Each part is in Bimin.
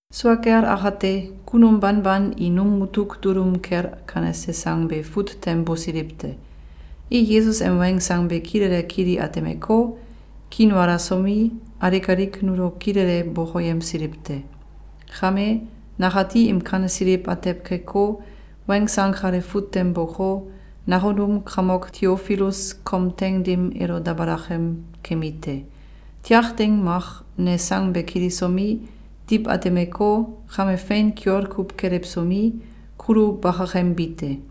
Sua kel akate, kunum banban i num mutuk dulum kel kanese sang be fut tem bosiliw te. I Yesus em weng sang be kilele kili atemeko, kiinwalasomi, alik alik nulo kilele bokoyemsiliw te. Kame, nakati im kanesiliw atew keko, weng sang kale fut tem boko, nakunum kamok Tiofilus kom teing dim elo dabalakem kemi te. Tiak ding mak ne sang be kilisomi, diw atemeko, kame fein kiol kuw kelewsomi, kulo bakakembi te.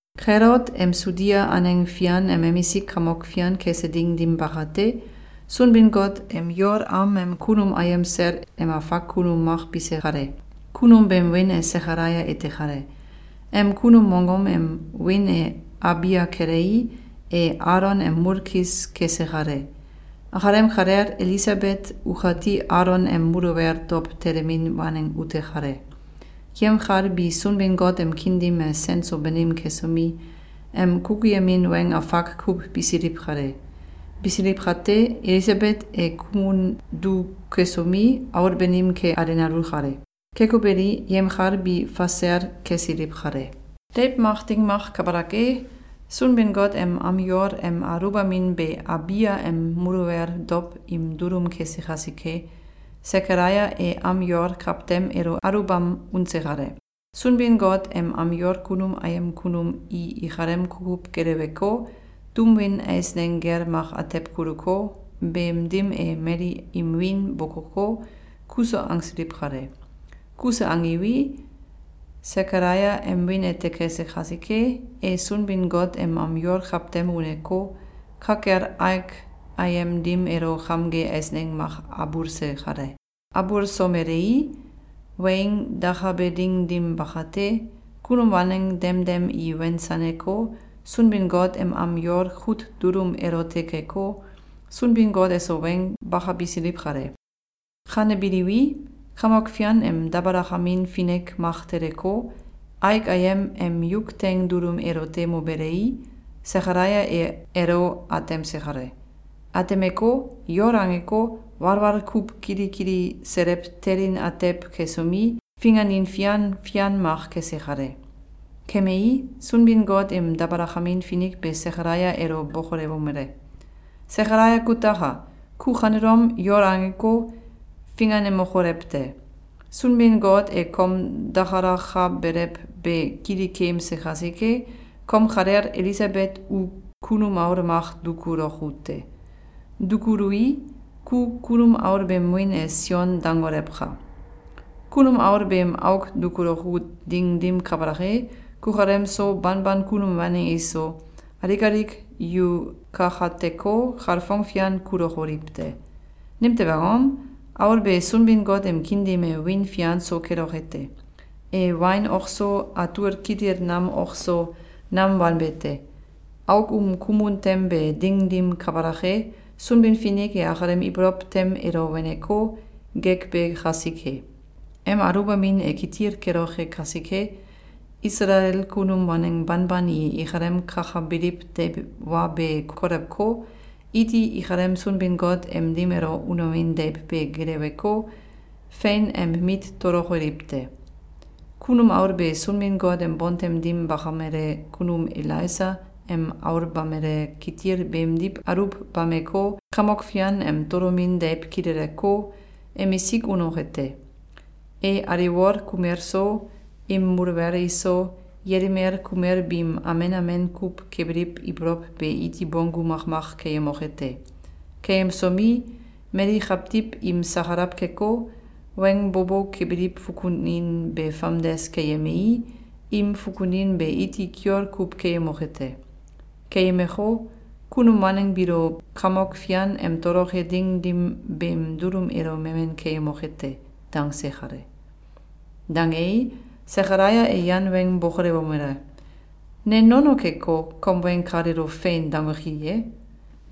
Kelot em Sudia aneng fian em emisik kamok fian kese ding dim bakate, Sunbin-Got em yol am em kunum ayem sel em afak kunum mak bise kale. Kunum beem wiin e Sekalaia ete kale. Em kunum mongom em wiin e Abia kelei, e Alon em mulkis kese kale. Akalem kalel Elisabet ukati Alon em muluwel dow telemin waneng ute kale. Yemkal bi Sunbin-Got em kiin dim e sen so banim kesomi, em kukuyemin weng afak kuw bisiliw kale. Bisiliw kate, Elisabet u kumun du kesomi, aul banim ke alenalu kale. Keko beli, yemkal bi fasel kesiliw kale. Deiw mak ding mak kabalak e, Sunbin-Got em am yol em aluwbamin be Abia im muluwel dow im dulum kese kasike, Sekalaia e am yol kawtem elo aluwbam unse kale. Sunbin-Got em am yol kunum ayem kunum i ikalem kukuw geleweko, tum win eisneng gel mak atew kuluko, beem dim e mali im wiin bokoko, kuse angsiliw kale. Kuse angiwi, Sekalaia em wiin ete kese kasike, e Sunbin-Got em yol am kawtem uneko, ka kel aik ayem dim elo kamge eisneng mak abulse kale. Abulsomelei, weing dakabe ding dim bakate, kunum waneng demdem i wensaneko, Sunbin-Got em am yol kut dulum elote keko, Sunbin-Got eso weng bakabisiliw kale. Kanebiliwi, Kamok Fian em dabalakamin finik mak teleko, aik ayem em yuk teing dulum elote mobelei, Sekalaia e elo atemse kale. Atemeko, yol angeko, walwal kuw kilikili selew telin atew kesomi, finganin fian fian mak kese kale. Kemei, Sunbin-Got em dabalakamin finik be Sekalaia elo bokolewomele: “Sekalaia kutaka! Ku kanelom, yol angeko, finganemokolew te! Sunbin-Got e kom dakalakabelew be kili keemse kasike, kom kalel Elisabet u kunum aul mak dukuloku te. Dukului, ku kunum aul beem wiin e Sion dangolewka! Kunum aul beem auk dukuloku ding dim kabalak e, kukalem so, banban kunum waneng iso, alik alik yu kakateko, kalfong fian kulokoliw te. Nimew angom? Aul be Sunbin-Got em kiin dim e wiin fian so keloke te. E wain ok so, atul kitil nam ok so, nam wanbe te. Auk um kumun tem be ding dim kabalak e, Sunbin-Finik e akalem ibolow tem elo weneko, gekbe kasike. Em aluwbamin e kitil keloke kasike, Isalael kunum waneng banban i ikalem kakabiliw deiw wa be kolewko, iti ikalem Sunbin-Got em dim elo unomin deiw be geleweko, fein em mit tolokoliw te. Kunum aul be Sunbin-Got em bontem dim bakamele kunum Elaisa em aulbamele kitil beemdiw aluwbameko, Kamok Fian em tolomin deiw kileleko, emisik unoke te. E aliwol kumel so, im muluwel iso, yelimel kumel biim amen amen kuw kebiliw ibolow be iti bonggu makmak keyemoke te. Keyemsomi, mali kawtiw im sakalaw keko, weng bo bo kebiliw fukunin be famdes keyemei, im fukunin be iti kiol kuw keyemoke te. Keyemeko, kunum waneng biilo Kamok Fian em toloke ding dim beem dulum elo memen keyemoke te.”, dangse kale. Dangei, Sekalaia e yan weng bokolewomele: “Ne nono keko, kom weng kaleelo ‘Fein!’, dangoki ye?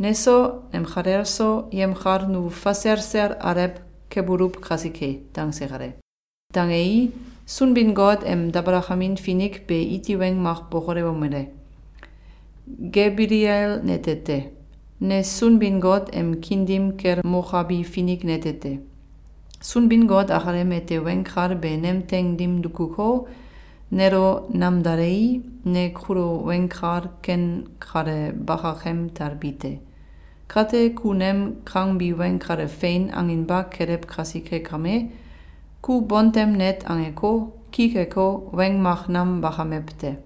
Neso, nem kalel so, yemkal nu fasel sel alew kebuluw kasike.”, dangse kale. Dangei, Sunbin-Got em dabalakamin finik be iti weng mak bokolewomele: “Gebiliel nete te. Ne Sunbin-Got em kiin dim kel mokabi finik nete te. Sunbin-Got akalem ete weng kal be nem teing dim dukuko, nelo namdalei, ne kulo weng kal ken kale bakakem talbi te. Kate ku nem kangbi weng kale “Fein!”, anginba kelew kasike kame, ku bontem net angeko, ki keko, weng mak nam bakamew te.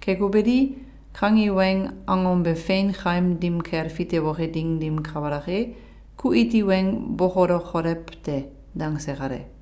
Keko beli, kangi weng angom be fein kaim dim kel fitewoke ding dim kabalak e, ku iti weng bokolokolew te.”, dangse kale.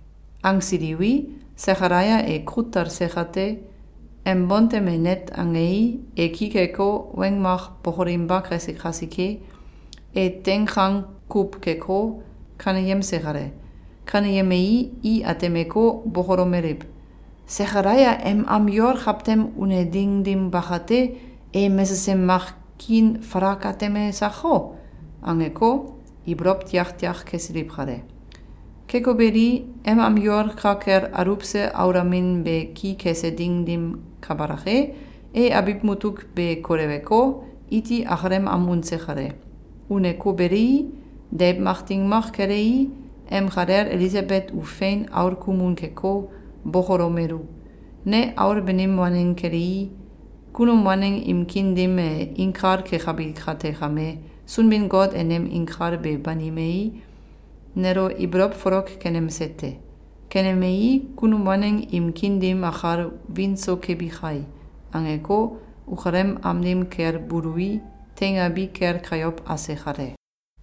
Angsiliwi, Sekalaia e kut talse kate, em bontem e net angei, e ki keko, weng mak bokolinba kese kasike, e teing kang kuw keko, kaneyemse kale. Kaneyemei, i atemeko, bokolomeliw: “Sekalaia em am yol kawtem une ding dim bakate, e mesesem mak kiin falak ateme sako?”, angeko, ibolow tiaktiak kesiliw kale. Keko beli, em am yol ka kel aluwse aulamin be ki kese ding ding kabalak e, e abiw mutuk be koleweko, iti akalem am unse kale. Uneko belei, deiw mak ding mak kelei, em kalel Elisabet u fein aul kumun keko, bokolomelu: “Ne aul banim waneng kelii, kunum waneng im kiin dim e inkal kekabi kate kame, Sunbin-Got e nem inkal be banimei, nelo ibolow folok kenemse te. Kenemei, kunum waneng im kiin dim akal wiin so kebi kai!”, angeko, ukalem am dim kel bului, teingabi kel kayow ase kale.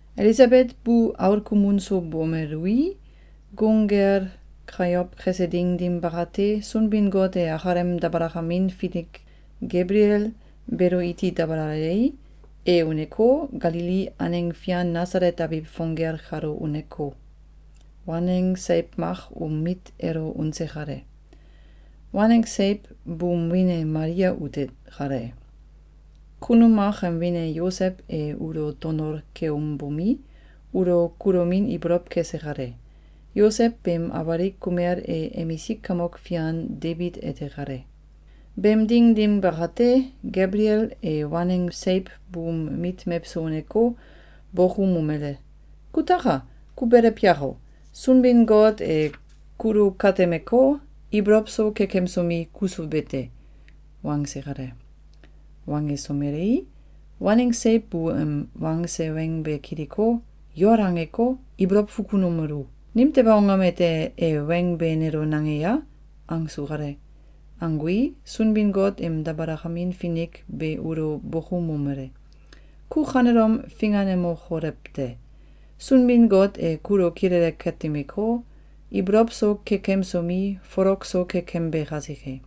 Elisabet bu aul kumun so bomelui, gung kel kayow kese ding dim bakate, Sunbin-Got e akalem dabalakamin finik Gebiliel beelo iti dabalalei, e uneko, Galili aneng fian Nasalet abiw fong gel kalo uneko, waneng seiw mak um mit elo unse kale. Waneng seiw buum wiin e Malia ute kale. Kunum mak em wiin e Yosew e ulo tonol keumbomi, ulo kulomin ibolow kese kale. Yosew beem awalik kumel e emisik kamok fian Debit ete kale. Beem ding dim bakate, Gabiliel e waneng seiw buum mit mewso uneko, bokoumomele: “Kutaka! Ku belew yako! Sunbin-Got e kulo katemeko, ibolow so kekemsomi, kuso be te!”, wangse kale. Wangesomelei, waneng seiw bu em wangse weng be kiliko, yol angeko, ibolow fukunomelu: “Nimtew angom ete e weng be nelo nange ya?”, angsu kale. Angui, Sunbin-Got em dabalakamin finik be ulo bokoumomele: “Ku kanelom finganemokolew te! Sunbin-Got e kulo kilele katemeko, ibolow so kekemsomi, folok so kekembe kasike.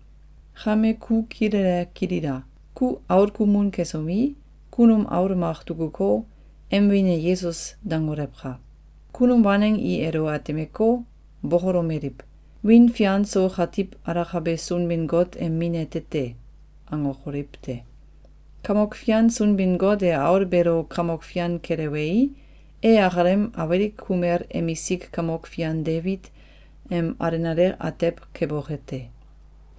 Kame ku kilele kilila! Ku aul kumun kesomi, kunum aul mak dukuko, em wiin e Yesus dangolewka! Kunum waneng i elo atemeko, bokolomeliw: ‘Wiin fian so katiw alakabe Sunbin-Got em min ete te!’, angokoliw te. Kamok Fian Sunbin-Got e aul beelo kamok fian kelewei, e akalem awalik kumel emisik kamok fian Debit em alenale atew keboke te.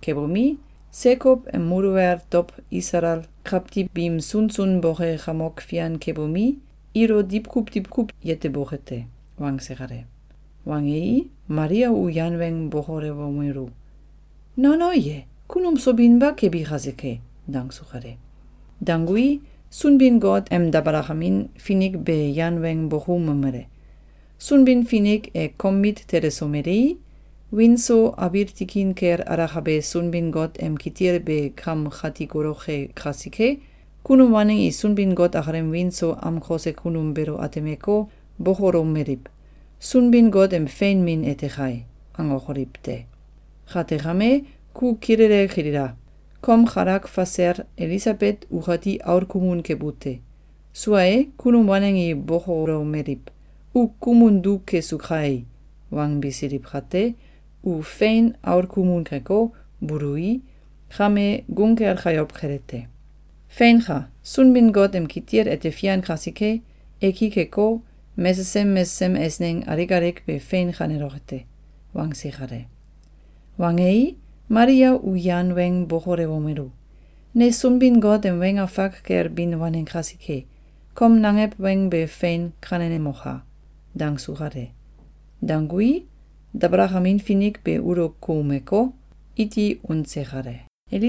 Kebomi, Sekow em muluwel dow Isalal kawtiw biim sunsun boke kamok fian kebomi, ilo diwkuw diwkuw yeteboke te.”, wangse kale. Wangei, Malia u yan weng bokolewomelu: “Nono ye? Kunum so binba kebi kasike.”, dangsu kale. Dangui, Sunbin-Got em dabalakamin finik be yan weng bokoumomele: “Sunbin-Finik e kom mit telesomelei, wiin so abiil tikin kel alakabe Sunbin-Got em kitil be kamkatigoloke kasike, kunum waneng i Sunbin-Got akalem wiin so amkose kunum beelo atemeko, bokolomeliw: ‘Sunbin-Got em fein min ete kai!’, angokoliw te. Kate kame, ku kilele kilila! Kom kalak fasel Elisabet ukati aul kumun kebu te. Sua e, kunum waneng i bokolomeliw: ‘U kumun du kesu kai!’, wangbisiliw kate, u fein aul kumun keko, bului, kame gung kel kayow kele te. Feinka! Sunbin-Got em kitil ete fian kasike, e ki keko, mesesem mesesem eisneng alik alik be fein kaneloke te.”, wangse kale. Wangei, Malia u yan weng bokolewomelu: “Ne Sunbin-Got em weng afak kel bin waneng kasike, kom nangew weng be fein kanenemoka!”, dangsu kale. Dangui, dabalakamin finik be ulo koumeko, iti unse kale.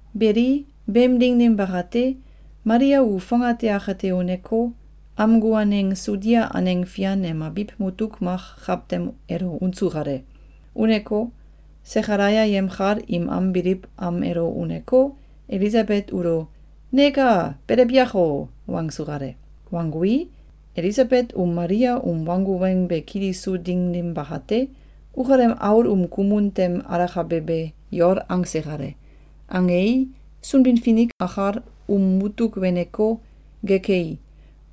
Beli, beem ding dim bakate, Malia u fongate akate uneko, amgu aneng Sudia aneng fian em abiw mutuk mak kawtem elo unsu kale. Uneko, Sekalaia yemkal im am biliw am elo uneko, Elisabet ulo “Neek a! Belew yako!”, wangsu kale. Wangui, Elisabet um Malia um wangu weng be kilisu ding dim bakate, ukalem aul um kumun tem alakabe be yol angse kale. Angei, Sunbin-Finik akal um mutuk weneko, gekei,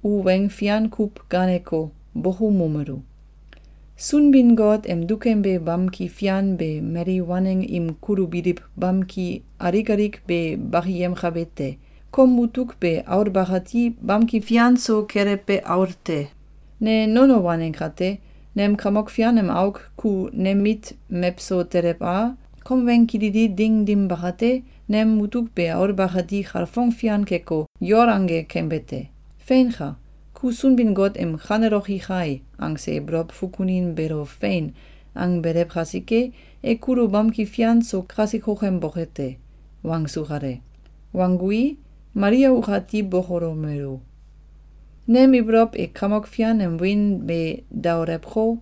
u weng fian kuw gaaneko, bokoumomelu: “Sunbin-Got em dukembe bamki fian be mali waneng im kulubiliw bamki alik alik be bakiyemkabe te. Kom mutuk be aul bakati bamki fian so kelewbe aul te. Ne nono waneng kate, nem Kamok Fian em auk ku nem mit mewso telew a? Kom weng kilili ding dim bakate, nem mutuk be aul bakati kalfong fian keko, yol ange kembe te. Feinka! Ku Sunbin-Got em ‘Kaneloki kai!’, angse ibolow fukunin beelo ‘Fein!’, angbelew kasike, e kulo bamki fian so kasikokemboke te.”, wangsu kale. Wangui, Malia ukati bokolomelu: “Nem ibolow e Kamok Fian em wiin be daolewko,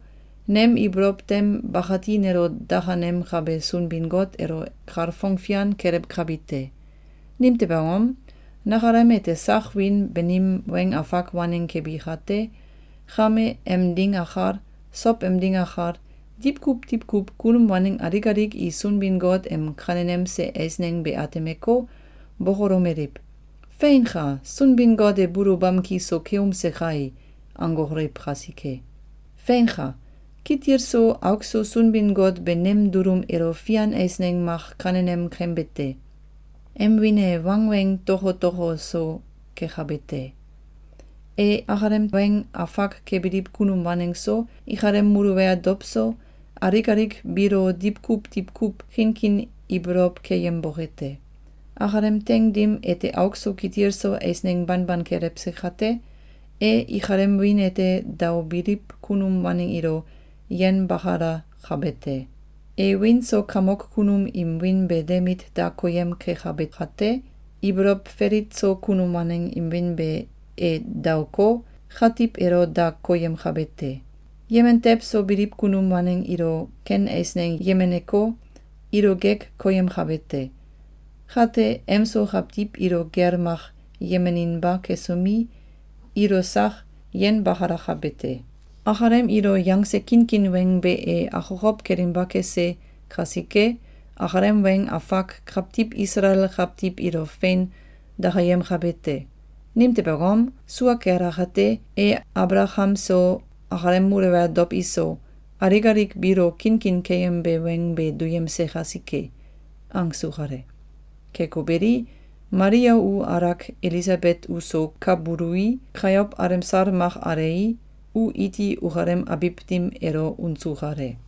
nem ibolow tem bakati nelo dakanemkabe Sunbin-Got elo kalfong fian kelewkabi te. Nimtew angom? Nakalem ete sak wiin banim weng afak waneng kebi kate, kame em ding akal, sow em ding akal, diwkuw diwkuw kunum waneng alik alik i Sunbin-Got em kanenemse eisneng be atemeko, bokolomeliw: ‘Feinka! Sunbin-Got e buulo bamki so keumse kai!’, angokoliw kasike. Feinka! Kitil so auk so Sunbin-Got be nem dulum elo fian eisneng mak kanenem kembe te. Em wiin e wangweng tokotoko so kekabe te. E akalem weng afak kebiliw kunum waneng so, ikalem muluwel dow so, alik alik biilo diwkuw diwkuw kinkin ibolow keyemboke te. Akalem teing dim ete auk so kitil so eisneng banban kelewse kate, e ikalem wiin ete daowbiliw kunum waneng ilo yenbakalakabe te. E wiin so kamok kunum im wiin be de mit da koyem kekabe kate, ibolow felit so kunum waneng im wiin be e daoko, katiw elo da koyemkabe te. Yemen tew so biliw kunum waneng ilo ken eisneng yemeneko, ilo gek koyemkabe te. Kate emso kawtiw ilo gel mak yemeninba kesomi, ilo sak yenbakalakabe te. Akalem ilo yangse kinkin weng be e akokow kelinba kese kasike, akalem weng afak kawtiw Isalael kawtiw ilo fein dakayemkabe te. Nimtew angom? Sua kel akate, e Abalakam so, akalem muluwel dow iso, alik alik biilo kinkin keyembe weng be duyemse kasike.”, angsu kale. Keko beli, Malia u alak Elisabet uso ka bului, kayow alemsal mak alei, u iti ukalem abiw dim elo unsu kale.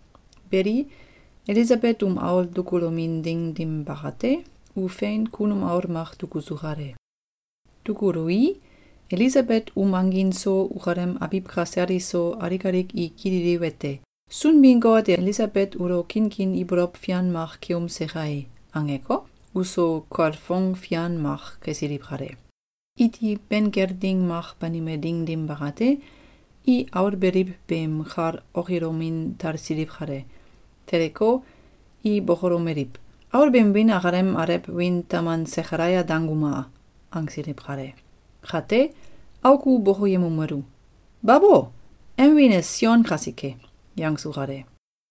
Beli, Elisabet um aul dukulomin ding dim bakate, u fein kunum aul mak dukusu kale. Dukului, Elisabet um angin so, ukalem abiw kasel iso, alik alik i kililiwete: “Sunbin-Got e Elisabet ulo kinkin ibolow fian mak keumse kai!”, angeko, uso kalfong fian mak kesiliw kale. Iti ben kel ding mak banime ding dim bakate, i aul beliw beem kal okilomin talsiliw kale. Teleko, i bokolomeliw: “Aul beem wiin akalem alew wiin taman Sekalaia danguma!”, angsiliw kale. Kate, auk u bokoyemomelu: “Babo! Em wiin e Sion kasike.”, yangsu kale.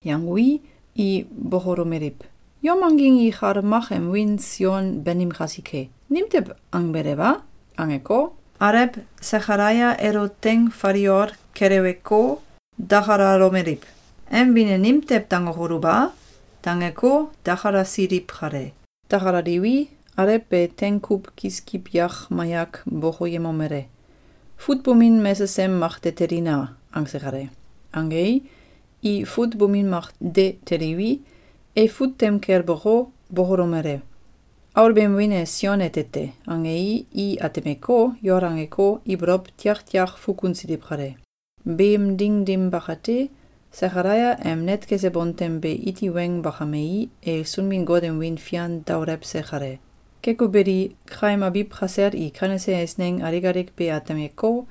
Yangui, i bokolomeliw: “Yom angin ikal mak em wiin Sion banim kasike, nimtew angbelew a?”, angeko, alew Sekalaia elo teing faliol keleweko, dakalalomeliw: “Em wiin e nimtew dangokoluw a?”, dangeko, dakalasiliw kale. Dakalaliwi, alew be teing kuw kiskiw yak mayak bokoyemomele: “Fut bomin mesesem mak de telina!”, angse kale. Angei, i fut bomin mak de teliwi, e fut tem kel boko, bokolomele: “Aul beem wiin e Sion ete te!”, angei, i atemeko, yol angeko, ibolow tiaktiak fukunsiliw kale. Beem ding dim bakate, Sekalaia em net kese bontem be iti weng bakamei, e Sunbin-Got em wiin fian daolewse kale. Keko beli, kaem abiw kasel i kanese eisneng alik alik be atemeko,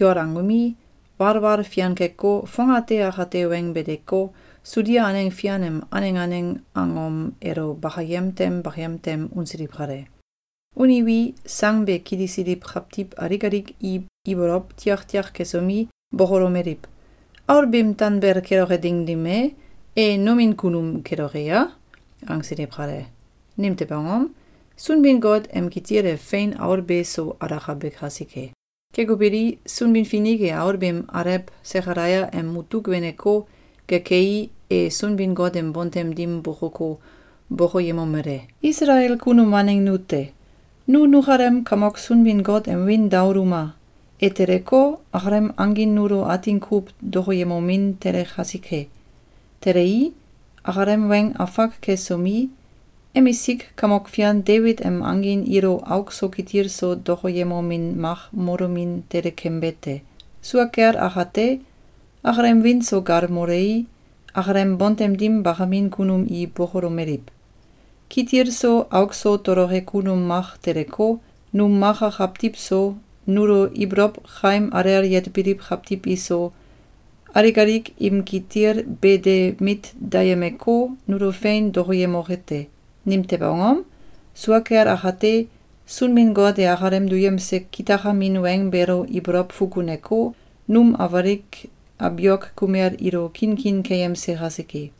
yol angomi, walwal fian keko, fongate akate weng be deko, Sudia aneng fian em aneng aneng angom elo bakayem tem bakayem tem unsiliw kale. Uniwi, sang be kilisiliw kawtiw alik alik i ibolow tiaktiak kesomi, bokolomeliw: “Aul beem tanbel keloke ding dim e, e nomin kunum keloke ya?”, angsiliw kale. Nimtew angom? Sunbin-Got em kitil e fein aul be so alakabe kasike. Keko beli, Sunbin-Finik e aul beem alew Sekalaia em mutuk weneko, gekei, e Sunbin-Got em bontem dim bokoko, bokoyemomele: “Isalael kunum waneng nute! Nu nukalem Kamok Sunbin-Got em wiin daoluma! E teleko, akalem angin nulo atin kuw dokoyemomin tele kasike. Telei, akalem weng afak kesomi, emisik kamok fian Debit em angin ilo auk so kitil so dokoyemomin mak molomin tele kembe te. Sua kel akate, akalem wiin so galmolei, akalem bontem dim bakamin kunum i bokolomeliw: “Kitil so auk so toloke kunum mak teleko, num maka kawtiw so, nulo ibolow kaim alel yetebiliw kawtiw iso, alik alik im kitil be de mit dayemeko, nulo fein dokoyemoke te. Nimtew angom? Sua kel akate, Sunbin-Got e akalem duyemse kitakamin weng beelo ibolow fukuneko, num awalik abiok kumel ilo kinkin keyemse kasike.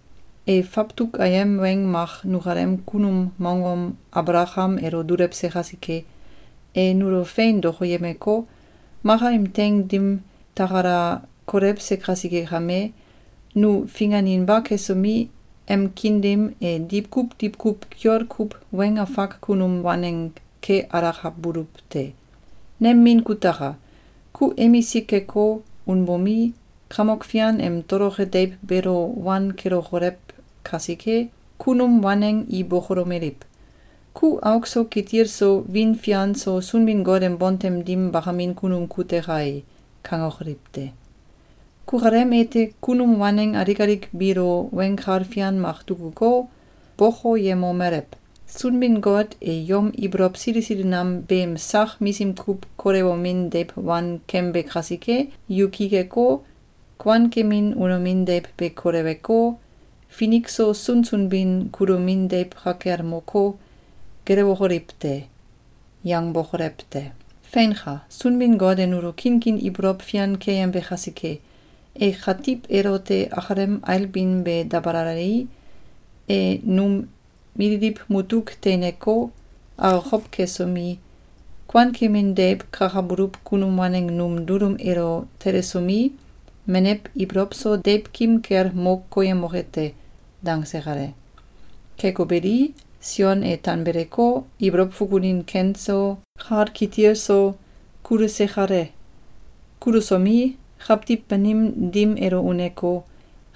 E fawtuk ayem weng mak nukalem kunum mongom Abalakam elo dulewse kasike, e nulo fein dokoyemeko, maka im teing dim takala kolewse kasike kame, nu finganinba kesomi, em kiin dim e diwkuw diwkuw kiol kuw weng afak kunum waneng ke alakabuluw te. Nem min kutaka! Ku emisik keko, unbomi, Kamok Fian em toloke deiw beelo wan kelokolew kasike, kunum waneng i bokolomeliw: ‘Ku auk so kitil so wiin fian so Sunbin-Got em bontem dim bakamin kunum kute kai!’, kangokoliw te. Kukalem ete kunum waneng alik alik biilo weng kal fian mak dukuko, bokoyemomelew: ‘Sunbin-Got e yom ibolow sili sili nam beem sak misim kuw kolewomin deiw wan kembe kasike, yu ki keko, kuankemin unomin deiw be koleweko, finik so sunsun bin kulomin deiw ka kel moko, gelewokoliw te.’, yangbokolew te. Feinka! Sunbin-Got e nulo kinkin ibolow fian keyembe kasike, e katiw elote akalem ailbin be dabalalei, e num mililiw mutuk teineko, akokow kesomi, kuankemin deiw kakabuluw kunum waneng num dulum elo telesomi, menew ibolow so deiwkim kel mo koyemoke te.”, dangse kale. Keko beli, Sion e tanbeleko, ibolow fukunin ken so, kal kitil so, kuluse kale. Kulusomi, kawtiw banim dim elo uneko,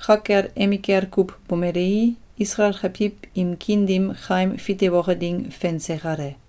ka kel emikel kuw bomelei, Isalael kawtiw im kiin dim kaim fitewoke ding fense kale.